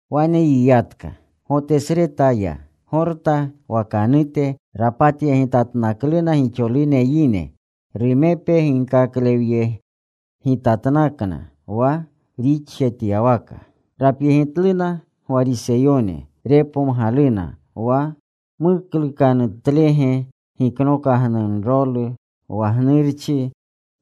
Wane yiyatka. Gotesreta ya, Gorta wakanute. Rapatyegitatnakluna gixolune yine. Rumepe ginkaklewyegitatnakna wa rixjetyawaka. Rapyegitluna Gwariseyone. Repomgaluna wa muklukanutlege giknokagnunrolu wa gnurchi.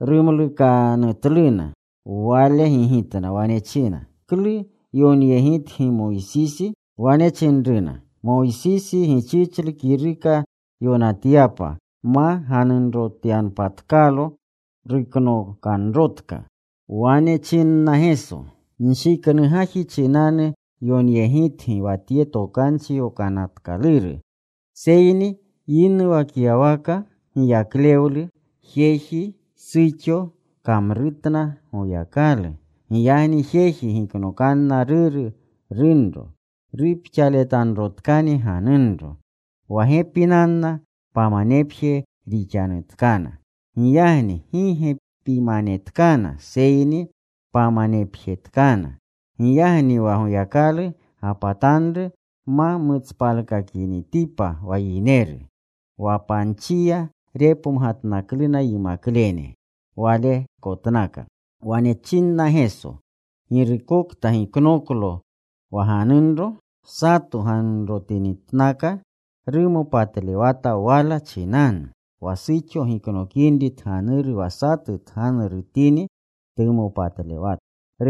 Rumlukanatluna. Wale gigitna. Wane china, “¿Klu yokanyegitgi Moysisi?” Wane chinruna, “Moysisi gichichlu kiruka yonatyapa ma ganunrotyanpatkalo. Ruknokanrotka.” Wane chinna Geso, “Nshiknu gaji chinanu yonyegitgi wa tye Tokanchi Yokanatkaluru. Seyni yinuwakyawaka giyaklewlu, jeji, suxo kamrutna Goyakalu. Giyagni jeji giknokanna ruru, runro. Rupxaletanrotkani ganunro. Wa gepinanna pamanepje rixanutkana. Giyagni gi gepimanetkana, seyni pamanepjetkana. Giyagni wa Goyakalu gapatanru ma mutspalkakinitipa wa yineru.” Wa panchiya repomgatnakluna yimaklene walekotnaka. Wane chinna Geso, “Girukokta giknoklo wa ganunro, sato ganunrotinitnaka rumopatlewata wala chinanu. Wa suxo giknokinri tganuru wa satu tganurutini, tumopatlewata.”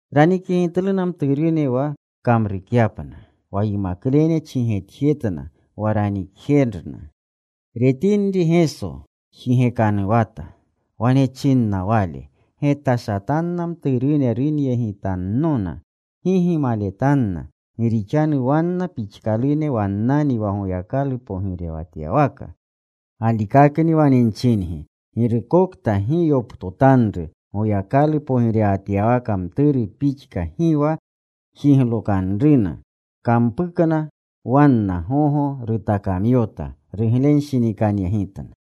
Ranikyegitluna mturune wa kamrukyapna. Wa yimaklene chigetjetna wa ranikjerna. Retinri Geso jigekanuwata. Wane chinna Wale, “Getashatanna mturune runyegitannona. Gi gimaletanna. Gi rixanu wanna pixkalune wannanni wa Goyakalu pogirewatyawaka. Galikakni wane nchingi, girukokta gi yoptotanru Goyakalu pogirewatyawaka mturu pixka gi wa jiglokanruna.” Kampukna. Wanna gogo rutakamyota. Ruglenshinikanyegitna.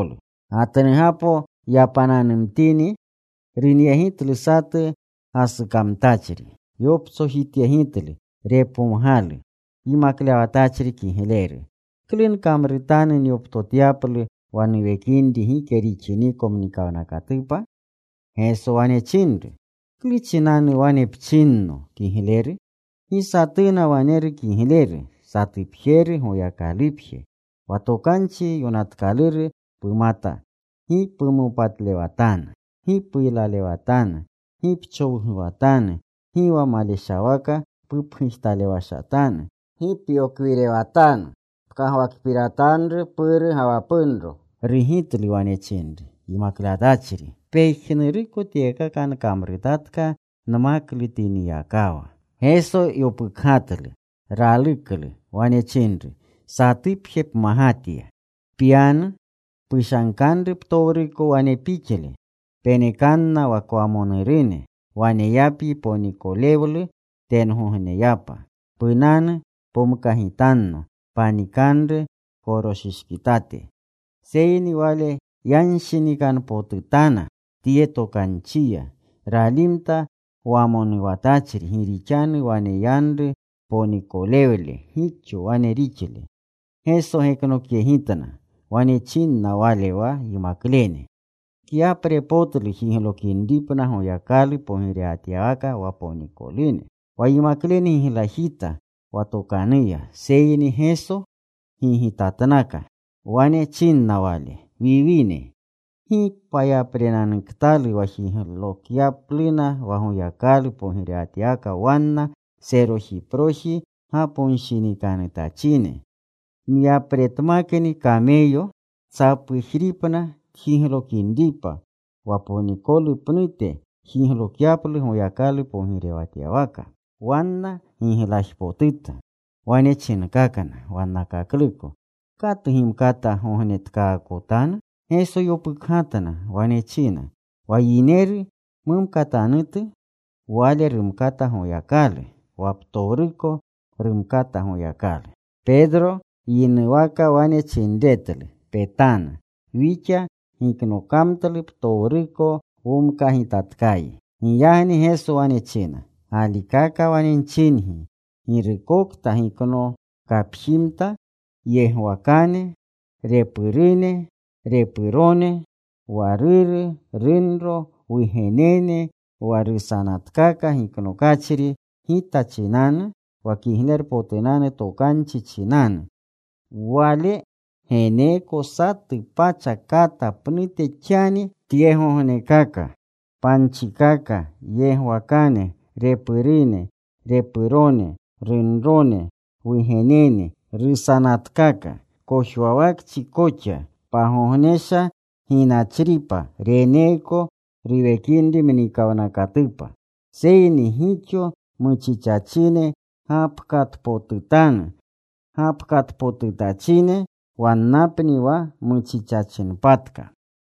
Gatnugapo yapananumtini, runyegitlu satu gasukamtachri. Yoptsojityegitlu. Repomgalu, “Yimaklewatachri kigleru ¿Klu nkamrutanu nyoptotyaplu wa nuwekinri gike rixiniko mnikawnakatupa?” Geso wane chinru, “¿Klu chinanu wane pchinno kigleru? Gi satuna waneru kigleru. Satupjeru, Goyakalupje. Wa Tokanchi Yokanatkaluru pumata: Gi pumopatlewatanu. Gi puylalewatanu. Gi pchowguwatanu. Gi wa maleshawaka pupgujtalewashatanu. Gi pyokwirewatanu. Pkagwakpiratanru puru ga wa punro.” Rugitlu. Wane chinru, “Yimaklewatachri, pejnuruko tyekaka nkamrutatka nmaklutinyakawa.” Geso yopukgatlu. Raluklu. Wane chinru, “Satupje pmagatya. Pyanu. Pushankanru ptowruko wane pixle. Penekanna wa kwamonurune. Waneyapyi ponikolewlu tengogneyapa. Punanu. Pomkagitanno. Panikanru pkoroshishkitate.” Seyni wale yanshinikanpotutana tye tokanchiya. Ralimta wamonuwatachri gi rixanu waneyanru ponikowle gixo wane rixle. Geso geknokyegitna. Wane chinna Wale wa yimaklene, “Kyaprepotlu jiglokinripna Goyakalu pogirewatyawaka wa ponikolune.” Wa yimaklene giglajita wa tokanuya, seyni Geso gigitatnaka. Wane chinna Wale, “Wiwine, ¡gi payaprenanutkalu wa jiglokyapluna wa Goyakalu pogirewatyawaka wanna serojiproji gaponshinikanutachine! Myapretmakni kameyo tsapujripna tjiglokinripa wa ponikolu pnute jiglokyaplu Goyakalu pogirewatyawaka.” Wanna giglajpotuta. Wane chinkakna wannakakluko, “¿Katu gimkata gognetkaakotanu?” Geso yopukgatna. Wane china, “Wa yineru mumkatanutu, wale rumkata Goyakalu. Wa ptowruko rumkata Goyakalu.” Petro yinuwaka wane chinretlu, “Petanu. Wixa giknokamtlu ptowruko. Womkagitatkayi.” Giyagni Geso wane china, “Galikaka wane nchingi, girukokta giknokapjimta, yegwakane, repurune, repurone, wa ruru, runro, wugenene, wa rusanatkaka giknokachri Gita chinanu, wa Kiglerpotunanu Tokanchi chinanu, wale geneeko satu pacha kata pnute xani tyegognekaka, panchikaka, yegwakane, repurune, repurone, runrone, wugenene, rusanatkaka, kojwawakchi koxa. Pagognesha ginachripa reneeko ruwekinri mnikawnakatupa. Seyni gixo muchichachine gapkatpotutanu. Gapkatpotutachine wannapni wa muchichachinpatka.”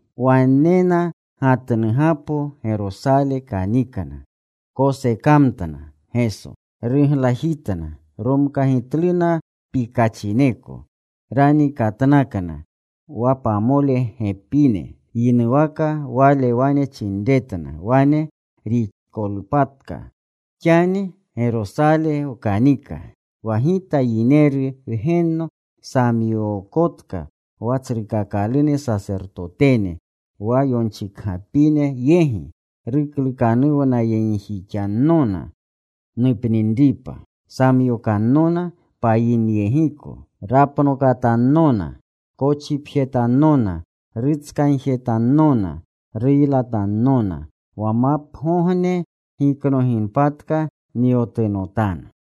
Wanena gatnugapo. Gerosale kanikna. Kosekamtna Geso. Ruglajitna. Romkagitluna pikachineko. Ranikatnakna wa pamole gepine. Yinuwaka Wale wane chinretna wane rixikolpatka: “Xani Gerosale wkanika. Wa Gita Yineru Wgenno samyookotka wa tsrukakalune sasertotene, wa yonchikapine yegi. Ruklukanuwnayegjixannona nupninripa. Samyokannona payinyegiko. Rapnokatannona. Kochipjetannona. Rutskagjetannona. Ruylatannona. Wa mapgogne giknoginpatka nyotunotanu.”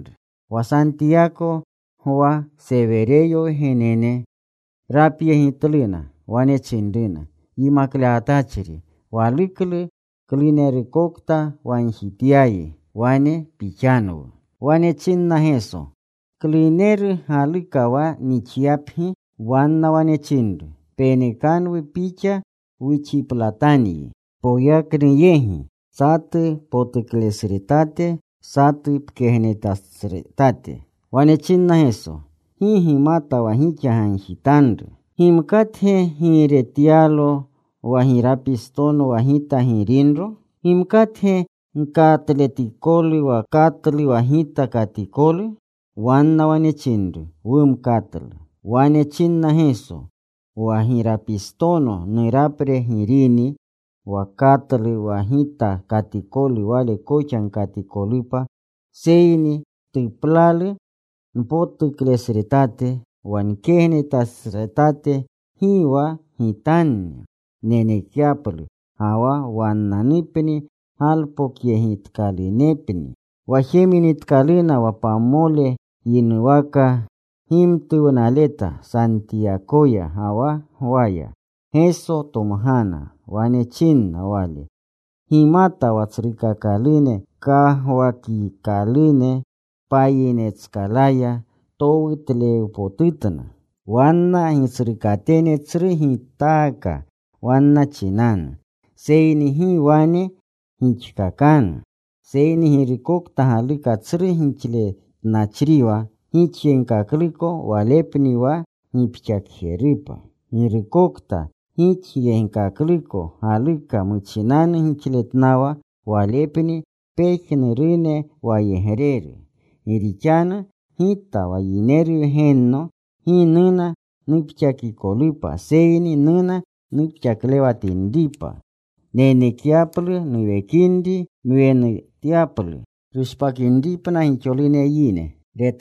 Wa Santiyako Gwa, Sewereyo wgenene, rapyegitluna. Wane chinruna, “Yimaklewatachri, waluklu klunerukokta wagjityayi wane pixanwu.” Wane chinna Geso, “¿Kluneru galuka wa nixyapgi?” Wanna wane chinru, “Penekanwu Pixa wuxiplatanyi poyaknu yegi, satu potuklesretate, satu pkegnetesretate.” Wane chinna Geso, “Gi gimata wa gixa gagjitanru. ¿Gimkatge giiretyalo wa girapistono wa Gita girinro? ¿Gimkatge gkatletikolu wa katlu wa Gita katikolu?” Wanna wane chinru, “Wumkatlu.” Wane chinna Geso, “Wa girapistono nurapre girini. Wa katlu wa Gita katikolu wale koxa gkatikolupa. Seyni tuplalu npotuklesretate, wa nkegnetesretate gi wa Gitanni nenekyaplu, ga wa wannanupni galpokyegitkalunepni.” Wa jeminitkaluna, wa pamole yinuwaka gimtuwnaleta Santiyakoya ga wa Gwaya Geso tomgana. Wane chinna Wale, “Gimata wa tsrukakalune kagwakikalune payinetskalaya towutlewpotutna. Wanna gitsrukatene tsru gitaaka wanna chinanu. Seyni gi wane gixkakanu, seyni girukokta galuka tsru gixletnachriwa gixayegkakluko walepni wa gipxakjerupa. Girukokta gixayegkakluko galuka muchinanu gixletnawa, walepni pejnurune wayegreru. Gi rixanu Gita wa Yineru Wgenno gi nuna nupxakikolupa, seyni nuna nupxaklewatinripa, nenekyaplu nuwekinri nwenutyaplu rushpakinripna gixolune yine.”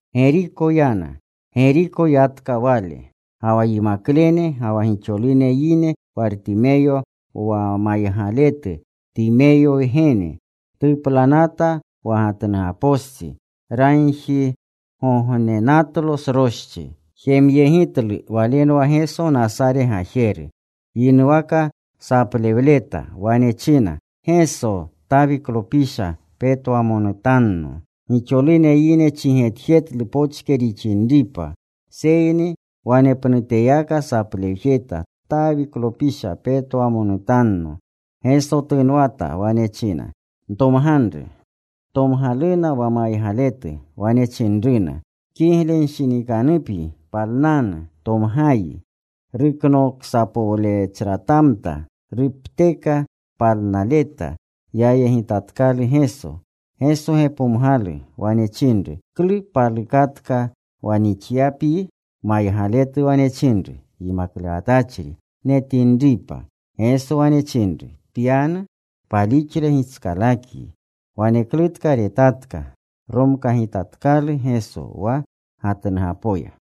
Geriko yana. Geriko yiyatka Wale, ga wa yimaklene, ga wa gixolune yine. Wartimeyo wa maygaletu, Timeyo wgene, tuplanata wa gatnugapostsi, ragjigognenatlo sroschi. Jemyegitlu Walenwa Geso Nasare gajeru. Yinuwaka saplewleta. Wane china, “Geso, Tawiklopisha, petwamonutanno.” Gixolune yine chigetjetlu pochke rixinripa, seyni wanepnuteyaka saplewjeta, “Tawiklopisha, petwamonutanno.” Geso tunwata. Wane china, “Ntomganru.” Tomgaluna wa maygaletu. Wane chinruna, “Kiglenshinikanupyi. Palnanu. Tomgayi.” Ruknoksapowlechratamta. Rupteka palnaleta. Yayegitatkalu Geso. Geso gepomgalu. Wane chinru, “¿Klu palukatka wa nixyapyi?” Maygaletu wane chinru, “Yimaklewatachri, netinripa.” Geso wane chinru, “Pyanu. Palixle gitskalakyi.” Waneklutka retatka. Romkagitatkalu Geso wa gatnugapoya.